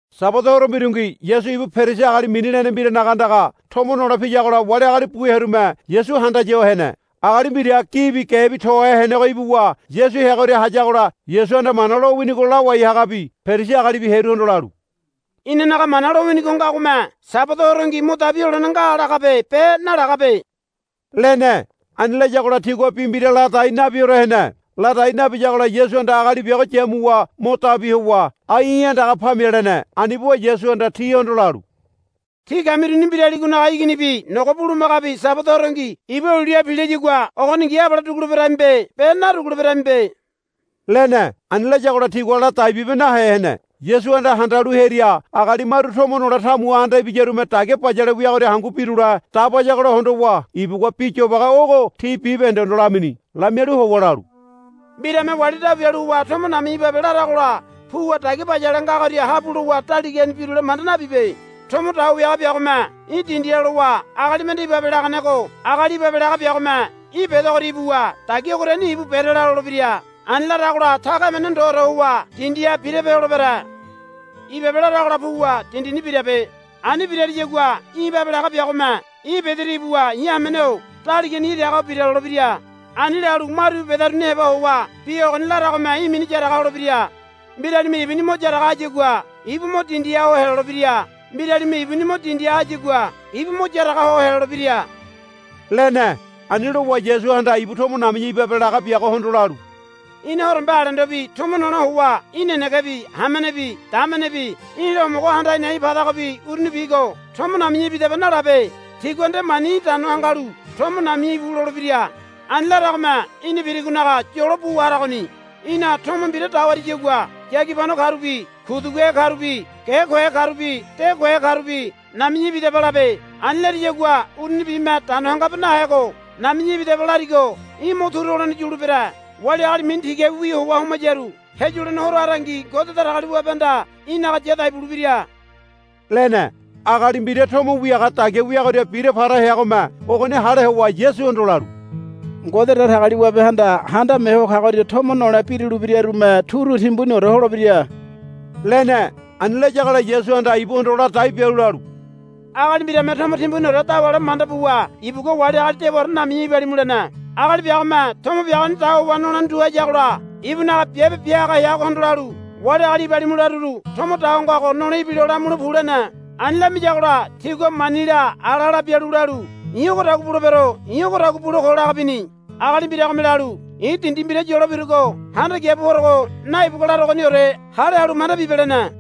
Sabada horo mbirungi Yasu ibu Perisi agali mini lene mbiranaga andaga tomo nole piyagola wali agali bu hearume Yasu handaya ho hene. Agali mbira gibi gebi tohe henego ibuwa Yasu heagoria hayagola Yasuhanda Mana lowinigo lawai hagabi Perisi agalibi hearuhondo lalu, Inanaga Mana lowinigo ngagome Sabada horongi mo dabi holene nga lagabe be nalagabe, lene. Ani layagola tigua bi mbira ladai nabiore hene. Ladai nabiyagola Yasuhanda agali biago yamuwa mo dabi howa, Ai í̠ andaga pamia, lene. Ani buwa Yasuhanda tihondo lalu, Tí kamiruni mbiraligonaga iginibi nogo bulumagabi Sabada horongi iba uliha pilayagua ogoningi abale duguleberamibe be naduguleberamibe, lene. Ani layagola tigua ladai bibe nahe hene. Yasuhanda handalu hearia agali maru tomo nole tamuha anda ibiyarume dagia bayale wiagoria hangu birule dabayagola hondowa ibugua bi yobage ogo ti bibahendehondo lamini. Lamialu howa lalu, Mbirame wali dabu bialu howa tomo nami̱ya ibabe laragola puwa dagia bayale ngagoria habu lowa daligani birule manda nabibe. Tomo dawa wiaga biagome í̠ dindiha lowa agali mende, Ibabe, laganego agali ibabe laga biagome í̠ bedegoria ibuwa, Dagia ogoriani ibu berela, lolebira. Ani laragola taga emene ndoore howa dindiha birape holebere. Ibabe, laragola puwa dindini birabe. Ani birariyagua í̠ ibabe laga biagome í̠ bederia ibuwa, I̱ hamene-o daligani iragaho bira, lolebira. Ani lalu maru íbu bedaruni heba howa bi ogoni laragome í̠ mini yaraga holebira. Mbiralime ibuni mo yaraga hayagua ibu mo dindiha ho helolebira. Mbiralime ibuni mo dindiha hayagua ibu mo yaraga ho helolebira, lene. Ani lowa Yasuhanda ibu tomo nami̱ya ibabe laga biagohondo lalu, Í̠na horombe alendobi tomo nole howa í̠ nenegebi hamenebi damenebi í̠la homogo handa a̱i̱ na̱i̱ padagobi urunibigo, Tomo nami̱ya ibidaba, nalabe. Tigua nde mani í̠ dano hangalu, Tomo nabiya íbu, lolebira. Ani laragome í̠na birigonaga yolo buwa haragoni. Í̠na tomo mbira dawariyagua yagibano karubi kuduguhe karubi ge kohe karubi de kohe karubi, Nami̱ya ibidaba, labe. Ani lariyagua urunibime dano hangabe nahego, Nami̱ya ibidaba, larigo í̠ mo turu holene yulebere. Wali agali mini tigabiwi howa homayaru heyulene horo harangi Ngode Datagaliwabehanda í̠naga yadai bulebira, lene. Agali mbira tomo wiaga dagia wiagoria bira para heagome ogoni hale howa Yasuhondo lalu, Ngode Datagaliwabehanda Handame Ho Kagoria tomo nole birule birarume turu timbuniore holebira, lene. Ani layagola Yasuhanda ibuhondo ladai bialu lalu, Agali mbirame tomo timbuniore dawale manda buwa ibugua wali agali dewaore, Nami̱ya ibalimu, lene. Agali biagome tomo biagoni dawawa nolene tu hayagola ibunaga biabe bia haga heagohondo lalu, Wali agali ibalimu laruru tomo dawa ngago nole ibilo lamule pu, lene. Ani lamiyagola tigua manila alala bialu lalu, I̱ ogodagua bulebero i̱ ogodagua bule ko, laga bini. Agali mbiragome lalu, I̱ dindi mbira yolo birugo handa kia bu porogo naibagua larogoniore hale halu manda bibe, lene.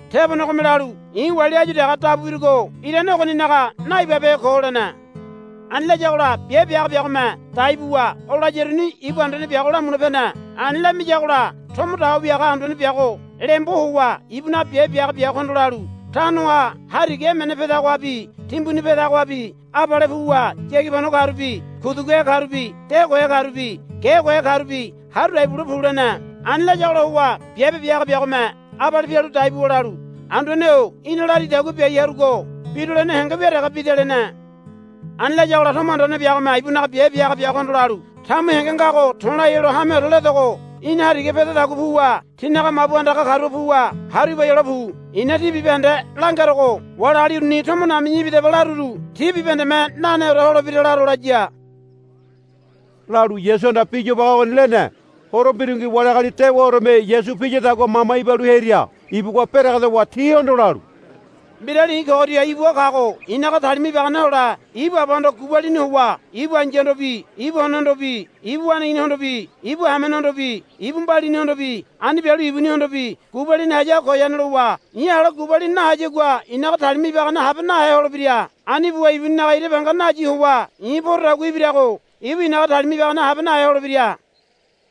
Tebonegome lalu, I̱ wali áyu dege dabu birugo irane ogoninaga naibabehe ko, lene. Ani layagola biabe bia haga biagome dai buwa o layaruni ibu anduane biago lamule pene. Ani lamiyagola tomo dawa wiaga anduane biago lembo howa ibunaga biabe bia haga biagohondo lalu, Tanoha hariga emene pedagohabi timbuni pedagohabi abale puwa yagibano karubi kuduguhe karubi de kohe karubi ge kohe karubi haru dai bule pu, lene. Ani layagola howa biabe bia haga biagome abale pialu dai buwa lalu, Anduane-o í̠na laridagua biai harugo birulene henge wia dege bida, lene. Ani layagola tomo anduane biagome ibunaga biabe bia haga biagohondo lalu, Tamu henge ngago to̱lai helo hameore ledogo í̠na hariga pedadagua puwa tinaga mabu andaga karuha puwa haru ibai hole pu. I̱na tí bibahende langerogo wali agali uruni, Tomo nami̱ya ibidaba, laruru ti bibahendeme naneore holebira laro, laya, lalu Yasuhanda bi yobage ogoni lene. Horo mbirungi wali agali dewaoreme Yasu piyadagua mama ibalu hearia ibugua beregedowa tihondo lalu, Mbirali i̱ kogoria ibua kago i̱naga talima ibagane hole ibu abahondo gubalini howa ibu ai̱yahondobi ibu onehondobi ibu waneiginihondobi ibu hamenehondobi ibu mbalinihondobi ani bialu ibunihondobi gubalini hayago goyane lowa i̱ ala gubalini nahayagua i̱naga talima ibagane habe nahe holebira. Ani buwa ibuninaga ira banga nayi howa i̱ porodagua ibirago ibu i̱naga talima ibagane habe nahe holebira.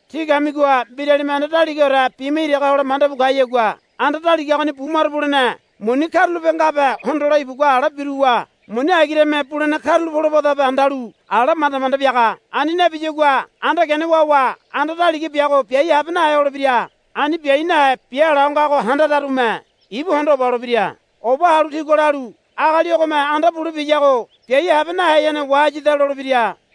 Tí kamigoha mbiralime anda daligaore bima iraga hole mandabu kayagua anda daliga ogoni bumaro bulene muni karulape ngabe hondole ibugua ala biruwa muni agirame bulene karula polobadabe handalu ala manda manda biaga. Ani nabiyagua anda gene wawa anda daliga biago biai habe nahe holebira. Ani biai nahe biala ho ngago handararume ibu hondo oba holebira. Oba halu tigua lalu, Agali ogome anda bule biyago biai habe naheyane wahayada, lolebira.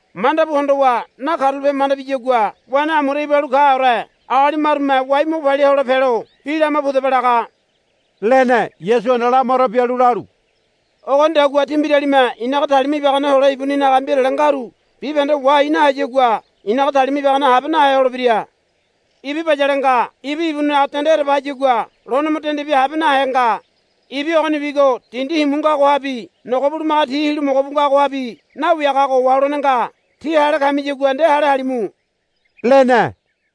Mandabu hondowa nakarula pobehe manda biyagua wene amura ibalu kaore agali marume wai mo palia hole pelo, Bi lama pudaba, laga, lene. Yasuhanda lamaro bialu lalu, Ogonidagua tí mbiralime i̱naga talima ibagane hole ibuninaga mbirale ngaru bibahende wahai nahayagua i̱naga talima ibagane habe nahe holebira, lene. Ibi bayale nga. Ibi ibuninaga dende ereba hayagua lone mo dende bia habe nahe nga. Ibi ogonibigo dindi himu ngagohabi nogo bulumaga ti hilu mogo bu ngagohabi nawiagago waholene nga. Tí hale kamiyagua nde hale halimu, lene.